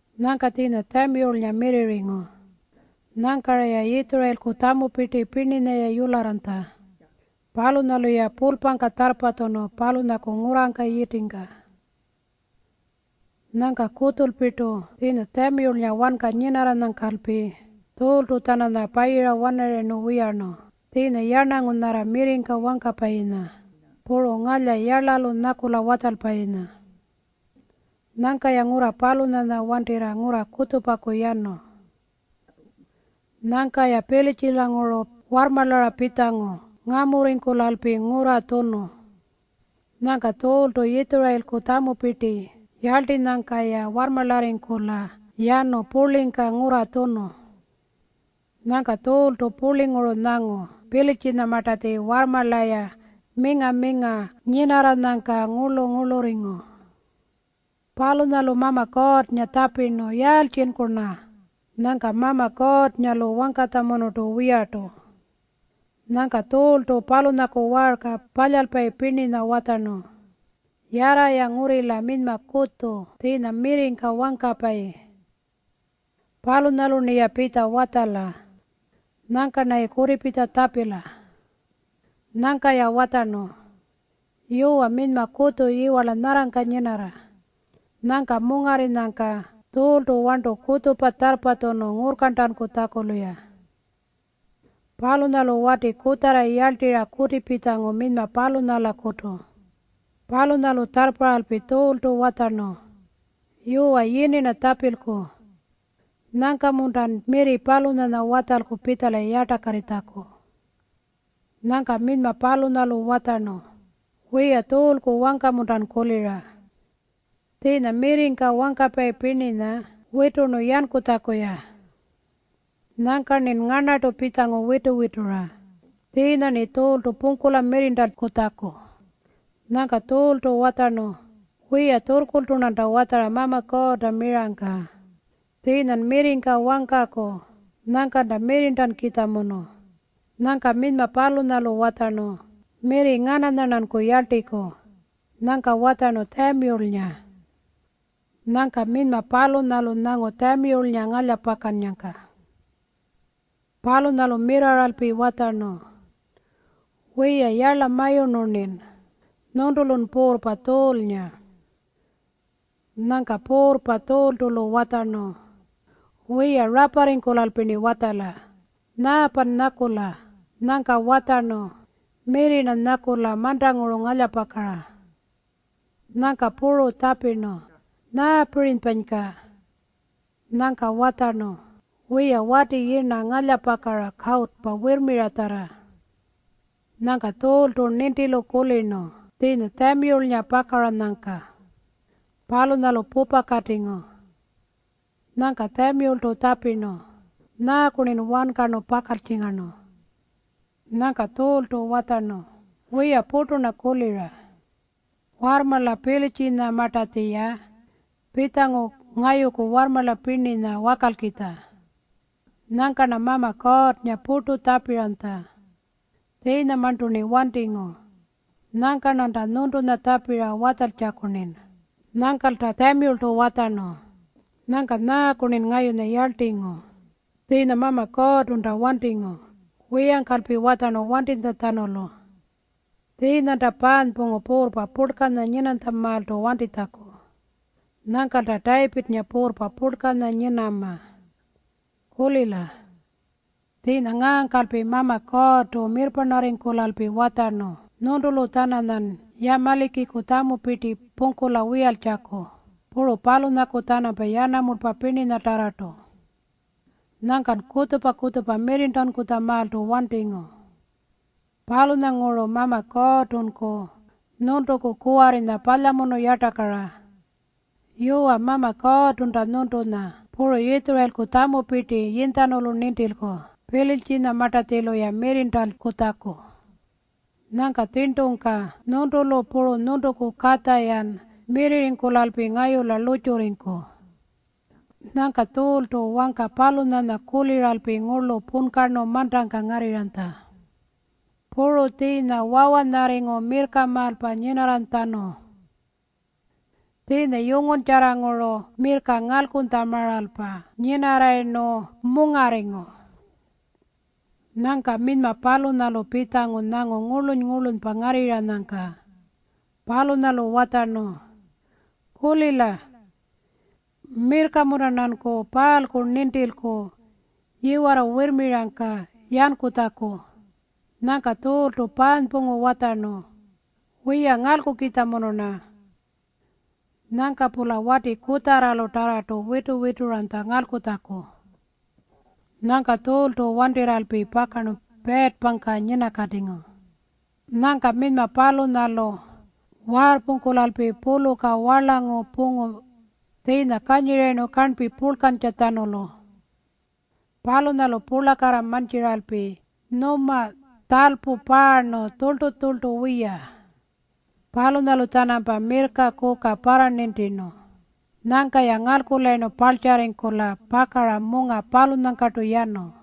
Nyangka tjiinya Tjamiyulnga mirrirringu. Nyangka-raya Yitjurayilku tjamupirti pirninya yularranytja. Palunyalu-ya pulpangka tjarrpatjunu palunyaku ngurrangka yitingka. Nyangka kutjulpirtu tjiinya Tjamiyulnga wanka nyinarranyangkalpi Tjuultu-tjananya payira-wanarayirnu wiyarnu, tjiinya yarnangu nyarra mirringka wangkapayinya puru ngalya yarlalu nyakula watjalpayinya. Nyangka-ya ngurra palunyanya wantirra ngurra kutjupakutu yanu. Nyangka-ya Pilitjilanguru warrmarlara pitjangu ngamurringkulalpi ngurra tjunu. Nyangka Tjuultu Yitjurayilku tjamupirti yarltinyangka-ya warrmarlarringkula yanu purlingka ngurra tjunu. Nyangka Tjuultu purlinguru nyangu Pilitjinyamartatji warrmarla-ya minga-minga nyinarranyangka ngurlu-ngurlurringu. Palunyalu Mama Kuurrnga tjapirnu, “Yaaltjinku-rna?” Nyangka Mama Kuurrnga-lu wangkanytjamunurtu wiyartu. Nyangka Tjuultu palunyaku waarka palyalpayi pirninya watjarnu, “Yarra-ya ngurrila minyma kutju tjiinya mirringka wangkapayi. Palunyalu-rniya pitja watjala. Nyangka-rnayi kutipitja tjapila.” Nyangka-ya watjarnu, “Yuwa, minyma kutju yiwarla nyarrangka nyinarra.” Nyangka mungarrinyangka Tjuultu warntu kutjupa tjarrpatjunu ngurrkarntankutjaku-luya. Palunyalu wati kutjarra yarltirra kutipitjangu minyma palunyalakutu. Palunyalu tjarrparralpi Tjuultu watjarnu, “Yuwa, yini-rna tjapilku. Nyangka-muntan mirri palunyanya watjalku pitjala yartakarritjaku?” Nyangka minyma palunyalu watjarnu, “Wiya, Tjuulku wangka-muntan kulira? Tjiinya mirringka wangkapayi pirninya witurnu yankutjaku-ya. Nyangka-rnin ngarnartu pitjangu witu-witura tjiinya-rni Tjuultu pungkula mirrirntankutjaku.” Nyangka Tjuultu watjarnu, “Wiya, tjurrkurltu-rnanta watjara Mama Kuurrta mirangka. Tjiinyan mirringka wangkaku, nyangkanta mirrirntankukitjamunu.” Nyangka minyma palunyalu watjarnu, “Mirri ngananya-rnanku yarltiku?” Nyangka watjarnu, “Tjamiyulnga.” Nyangka minyma palunyalu nyangu Tjamiyulnga ngalyapakaranyangka. Palunyalu mirrarralpi watjarnu, “Wiya, yarlamayurnu-rnin. Nyuntulun puurrpa Tjuulnga.” Nyangka puurrpa Tjuultu-lu watjarnu, “Wiya, raparringkulalpi-rni watjala. Nyaapan nyakula?” Nyangka watjarnu, “Mirri-rna nyakula mantanguru ngalyapakara.” Nyangka puru tjapirnu, “Nyaapirinypanyka?” Nyangka watjarnu, “Wiya, wati yirna ngalyapakara kawutu wirrmiratjarra.” Nyangka Tjuultu nintilu kulirnu tjiinya Tjamiyulnga pakaranyangka. Palunyalu pupakatingu. Nyangka Tjamiyultu tjapirnu, “Nyaaku-rnin wankarnu pakaltjingarnu?” Nyangka Tjuultu watjarnu, “Wiya, purtu-rna kulira. Warrmarla Pilitjinyamartatji-ya pitjangu ngayuku warrmarla pirninya wakalkitja. Nyangka-rna Mama Kuurrnga purtu tjapiranytja. Tjiinyamarntu-rni wantingu. Nyangka-rnanta nyuntunya tjapira watjaltjaku-rnin.” Nyangkalta Tjamiyultu watjarnu, “Nyangka nyaaku-rnin ngayunya yarltingu? Tjiinya Mama Kuurrtunta wantingu, wiyangkalpi watjarnu wantitjatjanulu. Tjiinyanta paanypungu puurrpa purlkanya nyinanytjamaaltu wantitjaku. Nyangkalta Tayipirrnga puurrpa purlkanya nyinama. Kulila. Tjiinya ngaangkalpi Mama Kuurrtu mirrparnarringkulalpi watjarnu nyuntulu-tjananyan Yamalikiku tjamupirti pungkula wiyaltjaku, puru palunyaku-tjanampa yanamulpa pirninyatarrartu. Nyangkan kutjupa-kutjupa mirrirntankutjamaaltu wantingu. Palunyanguru Mama Kuurrtunku nyuntuku kuwarrinya palyamunu yartakara. Yuwa, Mama Kuurrtunta nyuntunya puru Yitjurayilku tjamupirti yinytjanulu nintilku Pilitjinyamartatjilu-ya mirrirntankutjaku. Nyangka tjirntungka nyuntulu puru nyuntuku katja-yan mirrirringkulalpi ngayula lurrtjurringku.” Nyangka Tjuultu wangka palunyanya kuliralpi ngurlu punkarnu mantangka ngarrirranytja. Puru tjiinya wawanyarringu mirrkamaalpa nyinarranytjatjanu. Tjiinya yunguntjarranguru mirrka ngalkunytjamaalpa nyinarrayirnu mungarringu. Nyangka minyma palunyalu pitjangu nyangu ngurluny-ngurlunypa ngarrirranyangka. Palunyalu watjarnu, “Kulila. Mirrka-munta-rnanku paalku nintilku yiwarra wirrmirangka yankutjaku?” Nyangka Tjuultu paanypungu watjarnu, “Wiya, ngalkukitjamunu-rna.” Nyangka-pula wati kutjarralutarrartu witu-wituranytja ngalkutjaku. Nyangka Tjuultu wantirralpi pakarnu piirrpangka nyinakatingu. Nyangka minyma palunyalu waarrpungkulalpi puluka warlangu pungu, tjiinya kanyirayirnu karnpi purlkantjatjanulu. Palunyalu purlakarra mantjiralpi nyuma tjalpu paarnu tjurltu-tjurltu wiya. Palunyalu-tjanampa mirrka kuka parranintirnu. Nyangka-ya ngalkulayirnu parltjarringkula pakara munga palunyangkartu yanu.